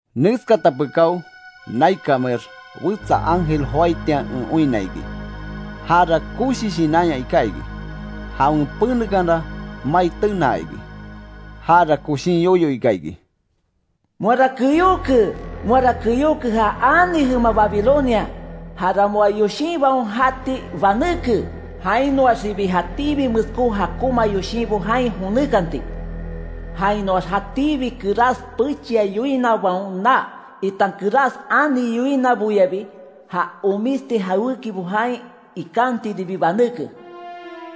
Neskata pekáo naikanmeax wetsa ángel joaitian en oinna iki. Jara koshi shinanya iká iki. Jawen penekanra mai tenaa iki. Jara koshin yoyo ika iki: “¡Moara keyóke. Moara keyóke, ja ani jema Babilonia! ¡Jara moa yoshinbaon jati banéke, jainoaxibi jatíbi meskó jakonma yoshinbo jain jonékanti. Jainoax jatíbi kerás pechia yoinabaon naa, itan kerás ani yoinaboyabi, ja omisti jawékibo jain ikantiribi banéke!”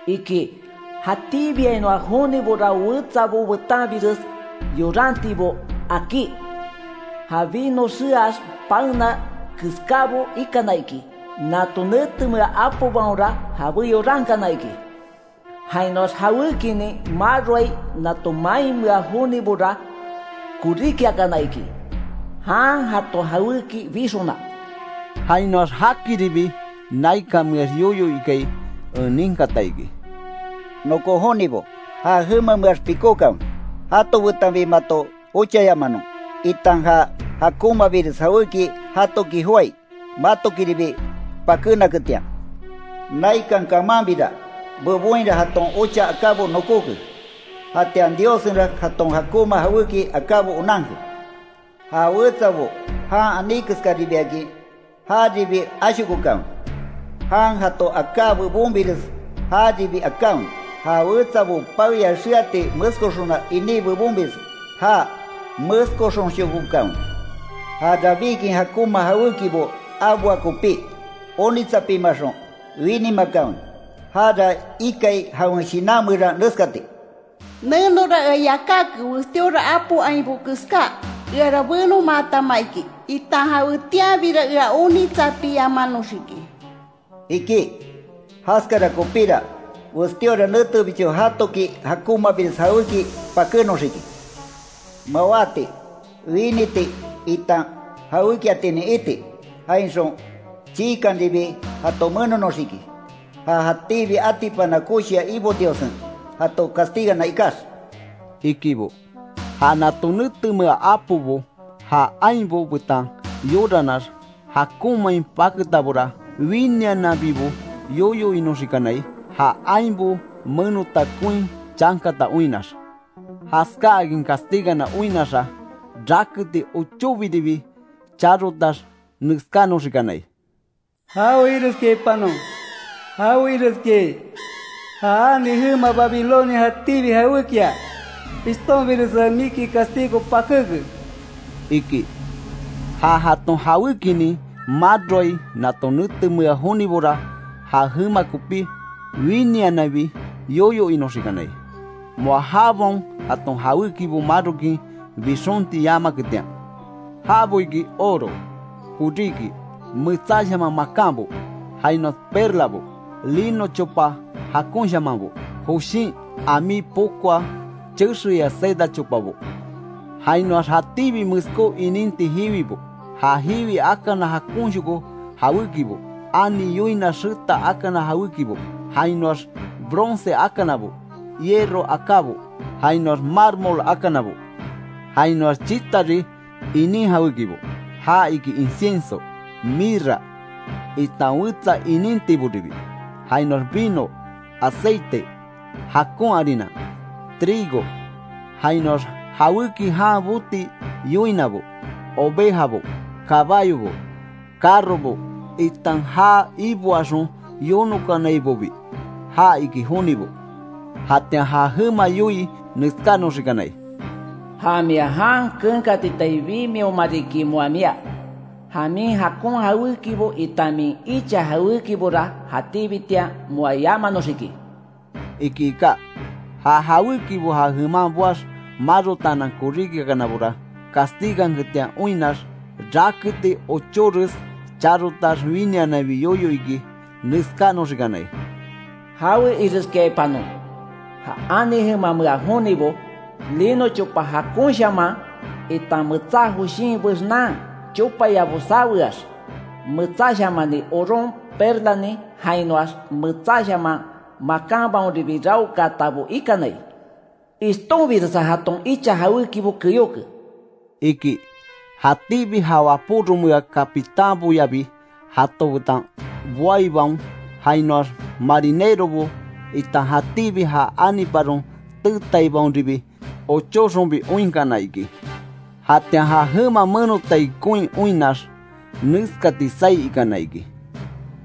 iki. Jatíbiainoa jonibora wetsabo betanbires yorantibo akí; ja vino xeax paena keskábo ikana iki, nato netemea apobaonra jabé yorankana iki. Jainoax jawékinin maroai nato mainmea jonibora, koríkiakana iki, jan jato jawéki bixona. Jainoax jakiribi naikanmeax yoyo ikai en ninkata iki: “Nokon jonibo, ja jemameax pikókanwe, jato betanbi mato ochayamanon, itan ja jakonmabires jawéki jatoki joái, matokiribi pakénaketian. Naikan kamanbira bebonhira jaton ocha akábo nokóke. Jatian Diossenra jaton jakonma jawéki akábo onanke. Ja wetsabo jan aní keskaribiakin, jaribi ashokokanwe, jan jato aká bebonbires jaribi akanwe; ja wetsabo paeya xeati meskoxona iní bebonbires já meskoxonshokokanwe. Ja rabíkin jakonma jawékibo aboa kopí, onitsapimaxon, winimakanwe. Jara ikai jawen shinan meran neskati: ‘Nenora ea yakáke, westíora apo ainbo keská; eara benomaatama iki, itan jawetianbira ea onitsapiamanoxiki’, iki. Jaskara kopíra, westíora netebicho jatoki jakonmabires jawéki pakénoxiki: mawáti, winiti itan jawékiatinin iti, jainxon chiikanribi jato menonoxiki, ja jatíbi atipana koshia Ibo Diossen, jato castigana ikax”, ikibo. Ja nato netemea apobo ja ainbo betan yorannax jakonmain paketabora; winiananbibo yoyo inoxikanai, ja ainbo menota koin chankata oinnax. Jaskáakin castigana oinnaxa, raketi ochóbiribi charotax neskánoxikanai: “¡Jawe ireskiaipanon, jawe ireskiai; ja ani jema Babilonia jatíbi jawékia, ishtonbiresa miki castigo pakéke!” iki. Ja jaton jawékinin maroai nato netemea jonibora ja jema kopi, winiananbi yoyo inoxikanai, moa jabaon jaton jawékibo marokin bixonti yamaketian. Jabo iki: Oro, koríki, metsáshaman makanbo, jainoax perlabo, lino chopa jakonshamanbo, joshin ami pokoa chexeya seda chopabo. Jainoax jatíbi meskó ininti jiwibo; ja jiwi akana jakonshoko jawékibo, ani yoina xeta akana jawékibo; jainoax bronce akanabo, hierro akábo, jainoax mármol akanabo, jainoax chitari, inin jawékibo; ja iki incienso, mirra, itan wetsa inintiboribi. Jainoax vino, aceite, jakon harina, trigo, jainoax jawéki jan boti yoinabo, ovejabo, kabayobo, carrobo, itan ja iboaxon yonokanaibobi, ja iki jonibo. Jatian ja jema yoii neskánoxikanai: “¡Ja mia jan keenkatitai bimioma riki moa mia; ja min jakon jawékibo itan min icha jawékibora, jatíbitian moa yamanoxiki!” iki ika. Ja jawékibo ja jeman boax marotaanan koríkiakanabora, castiganketian oinnax, raketi ochóres charotax winiananbi yoyo iki, neskánoxikanai: “¡Jawe ireskiaipanon, ja ani jemamea jonibo! Lino chopa jakonshaman, itan metsá joshin bexnan chopayabo saweax, metsáshamani oron, perlanin jainoax metsáshaman makanbaonribi raokaatabo ikanai. ¡Ishtonbiresa jaton icha jawékibo keyóke!” iki. Jatíbi ja wapóromea capitánboyabi jato betan boaibaon, jainoax marinerobo, itan jatíbi ja aniparon teetaibaonribi ochóxonbi oinkana iki. Jatian ja jema menotai koin oinnax, neskati saí ikana iki: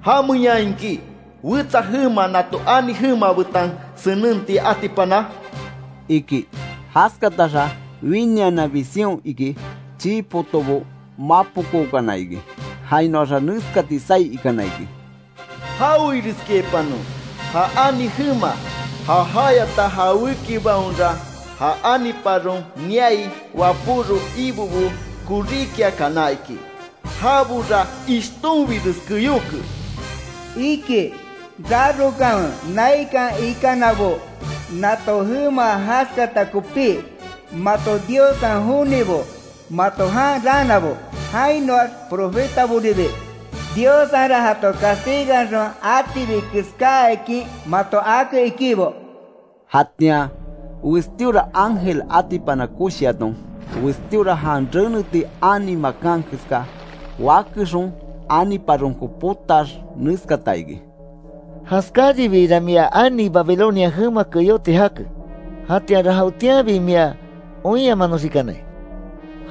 “¿Jamenyaa iki, wetsa jema nato ani jema betan senenti atipana?” iki. Jaskataxa winiananbi sion iki, chii potobo mapokookana iki, jainoxa neskati saí ikana iki: “¡Jawe ireskiaipanon, ja ani jema! Ja jayata jawékibaonra; ja aniparon niai wapóro ibobo koríkiakana iki. ¡Jabora ishtonbires keyóke!” iki. Rarokanwe naikan ikanabo, nato jema jaskata kopí; mato Diossen jonibo, mato jan raanabo, jainoax profetaboribi, Diossenra jato castiganxon atibi keskáakin mato ake ikibo. Jatian westíora ángel atipana koshiaton, westíora jan reneti ani makan keská wakexon aniparonko potaax neskata iki: “Jaskáribiira mia ani Babilonia jema keyóti jake, jatianra jawetianbi mia oinyamanoxikanai.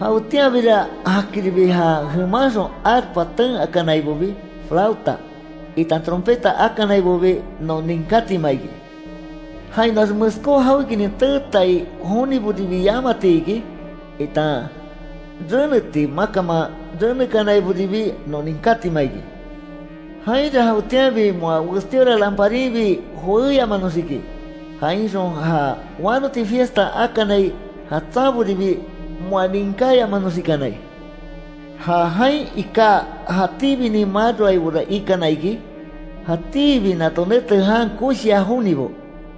Jawetianbira jakiribi ja jemanxon arpa ten akanaibobi, flauta, itan trompeta akanaibobi non ninkátima iki. Jainoax meskó jawékinin teetai joniboribi yamati iki, itan reneti makanman renekanaiboribi non ninkátima iki. Jainra jawetianbi moa westíora lanparinbi joéyamanoxiki. Jainxon ja wanoti fiesta akanai jatsanboribi moa ninkáyamanoxikanai. Ja jain iká jatíbinin maroaibora ikana iki, jatíbi nato nete jan koshia jonibo,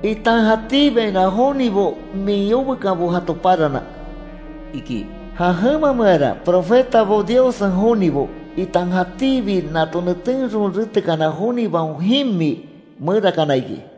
itan jatíbiainoa jonibo min yobekanbo jato parana”, iki. Ja jemameara, profetabo, Diossen jonibo, itan jatíbi nato netenxon retekana jonibaon jimi merakana iki.